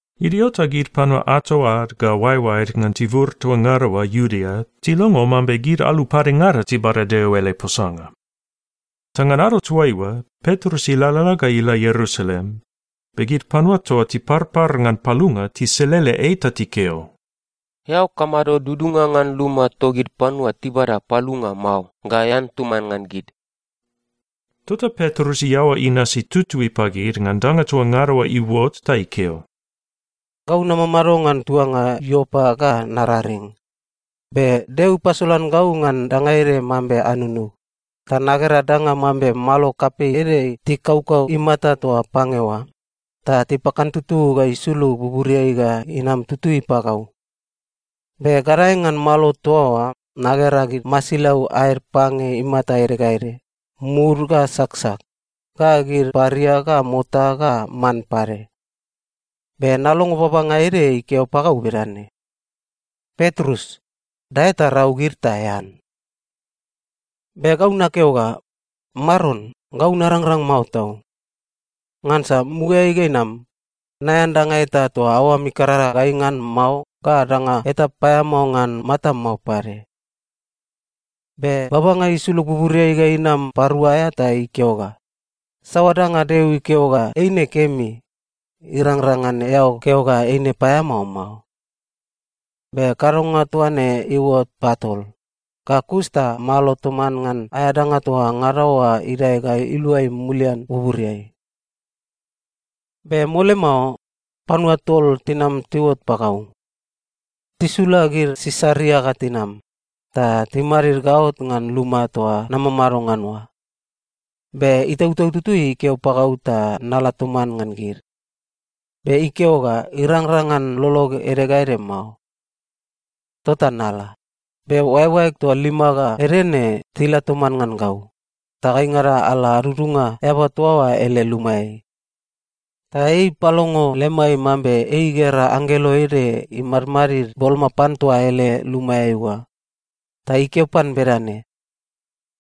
Idio ta gid panua ato ad ga oaeoaed ngan tibur toa ngada oa Iudea tilongo mambe gid alu padengada tibada Deo ele posanga. Ta ngan ado toaiua, Petrus ilalala ga ila Ierusalem, be gid panua toa tiparpar ngan palunga tiselele ei ta tikeo, “Eao kamado dudunga ngan luma togid panua tibada palunga mao ga ean toman ngan gid?” Tota Petrus iaoa inasi tutui pagid ngan danga toa ngada oa iuot ta ikeo, “Gau namamado ngan tuanga Iopa ga nararing. Be Deo ipasolan gau ngan danga ede mambe anunug, ta nagera danga mambe malo kapei ede tikaukau imata toa pange oa, ta tipakantutu ga isulug buburiai ga inam tutui pagau. Be gadae ngan malo toa oa nagera gid masilau aed pange imata ede ga ede, mud ga saksak, ga gid paria ga mota ga man pade. Be nalongo babanga ede ikeo pagau bedane, ‘Petrus, dae ta rau gid ta ean.’ “Be gau nakeo ga, ‘Maron, gau narangrang mao tau. Ngansa mugaeai ga inam, naean danga eta toa aoam ikarara gai ngan mao ga danga eta paeamao ngan matam mao pade.’ “Be babanga isulug buburiai ga inam parua aea ta ikeo ga, ‘Saoa danga Deo ikeo ga eine kemi, irangrang ngan eao keo ga eine paeamao mao.’ Be kadonga toa ne iuot patol, ga kus ta malo toman ngan aea danga toa ngada oa idae ga iluai mulian buburiai. “Be mole mao, panua tol tinam tiuot pagau. Tisula gid Sisaria ga tinam, ta timadid gaot ngan luma toa namamado ngan oa. Be Itautau Tutui ikeo pagau ta nala toman ngan gid, be ikeo ga irangrang ngan lolog ede ga ede mao. Tota nala, be oaeoaeg toa lima ga ede ne tila toman ngan gau, ta gaingada ala adudunga eaba toa oa ele lumaeai. Ta ei ipalongo lemai mambe ei igera anggelo ede imadmadid boloma pan toa ele lumaeai oa, ta ikeo pan bedane,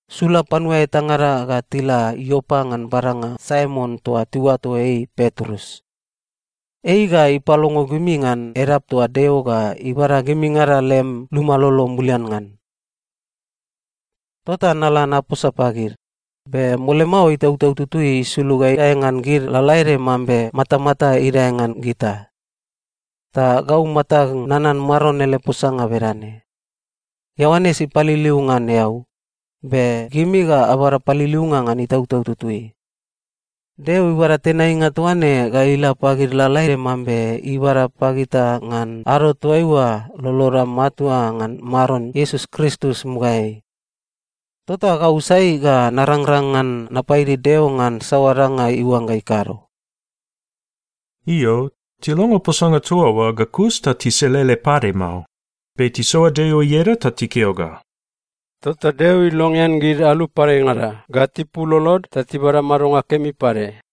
‘Sula panua etangada ga tila Iopa ngan badanga Saimon toa tiuato ei Petrus. Ei ga ipalongo gimi ngan edap toa Deo ga ibada gimingada lem luma lolo mulian ngan.’ “Tota nala naposa pagid, be mole mao Itautau Tutui isulug ga idae ngan gid lalaede mambe matamata idae ngan gita. Ta gau matag nanan Maron ele posanga bedane, ‘Ioanes ipaliliu ngan eau, be gimi ga abada paliliunga ngan Itautau Tutui.’ Deo ibada tenainga toa ne ga ila pagid lalaede mambe ibada pagita ngan ado toaiua loloda matua ngan Maron Iesus Kristus mugaeai. Tota gau sai ga narangrang ngan napaidi Deo ngan saoa danga iuangga ikado?” Io, tilongo posanga toa oa ga kus ta tiselele pade mao, be tisoa Deo ieda ta tikeo ga, “Tota Deo ilongean gid alu padengada ga tipul lolod ta tibada madonga kemi pade!”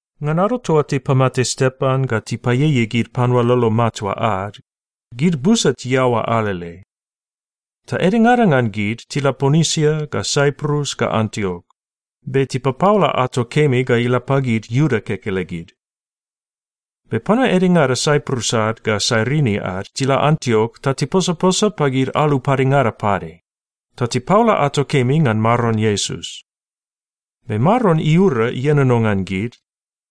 Ngan ado toa tipamate Stepan ga tipaieiei gid panua lolo matua ad, gid busa tiaoa alele. Ta edengada ngan gid tila Ponisia ga Saiprus ga Antiok, be tipapaola ato kemi ga ila pagid Iuda kekelegid. Be panua edengada Saiprus ad ga Sairini ad tila Antiok ta tiposaposa pagid alu padengada pade, ta tipaola ato kemi ngan Maron Iesus. Be Maron iura ienono ngan gid,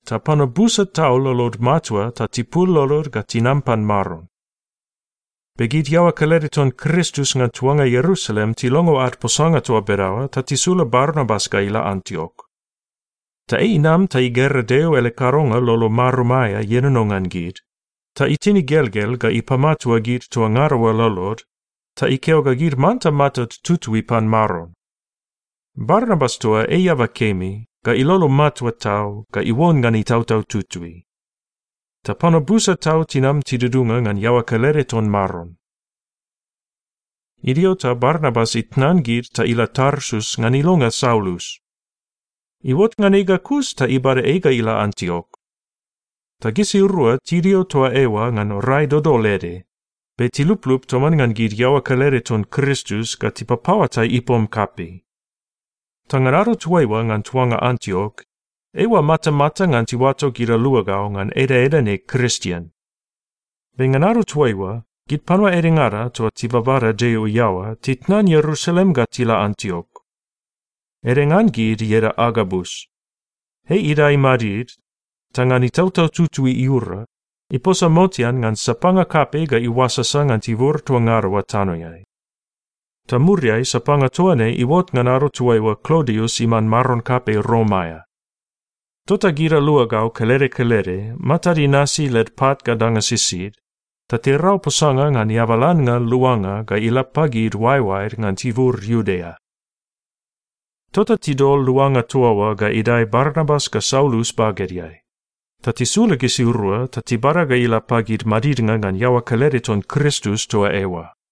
ta panua busa tau lolod matua ta tipul lolod ga tinam pan Maron. Be gid iaoa kelede ton Kristus ngan tuanga Ierusalem tilongo ad posanga toa bedaoa ta tisula Barnabas ga ila Antiok. Ta ei inam ta igera Deo ele kadonga lolo marum aea ienono ngan gid, ta itin igelgel ga ipamatua gid toa ngada oa lolod, ta ikeo ga gid manta matad tutui pan Maron. Barnabas toa ei eaba kemi, ga ilolo matua tau, ga iuon ngan Itautau Tutui. Ta panua busa tau tinam tidudunga ngan iaoa kelede ton Maron. Idio ta Barnabas itnan gid ta ila Tarsus ngan ilonga Saulus. Iuot ngan ei ga kus ta ibada ei ga ila Antiok. Ta gisirua tidio toa eoa ngan rai dodol ede, be tiluplup toman ngan gid iaoa kelede ton Kristus ga tipapaoatai ipom kapei. Ta ngan ado toaiua ngan tuanga Antiok, eiua matamata ngan tiuato gid aluagau ngan edaeda ne Kristien. Be ngan ado toaiua, gid panua edengada toa tibabada Deo iaoa titnan Ierusalem ga tila Antiok. Ede ngan gid ieda Agabus. Ei idae imadid, ta ngan Itautau Tutui iura, iposa motean ngan sapanga kapei ga iuasasa ngan tibur toa ngada oa tanoeai. Ta muriai, sapanga toa ne iuot ngan ado toaiua Klodius iman maron kapei Rom aea. Tota gid aluagau kelede kelede matad inasi led pat ga danga sisid, ta tirau posanga ngan eabalannga luanga ga ila pagid oaeoaed ngan tibur Iudea. Tota tidol luanga toa oa ga idae Barnabas ga Saulus bagedeai, ta tisula gisirua ta tibada ga ila pagid madidnga ngan iaoa kelede ton Kristus toa eoa.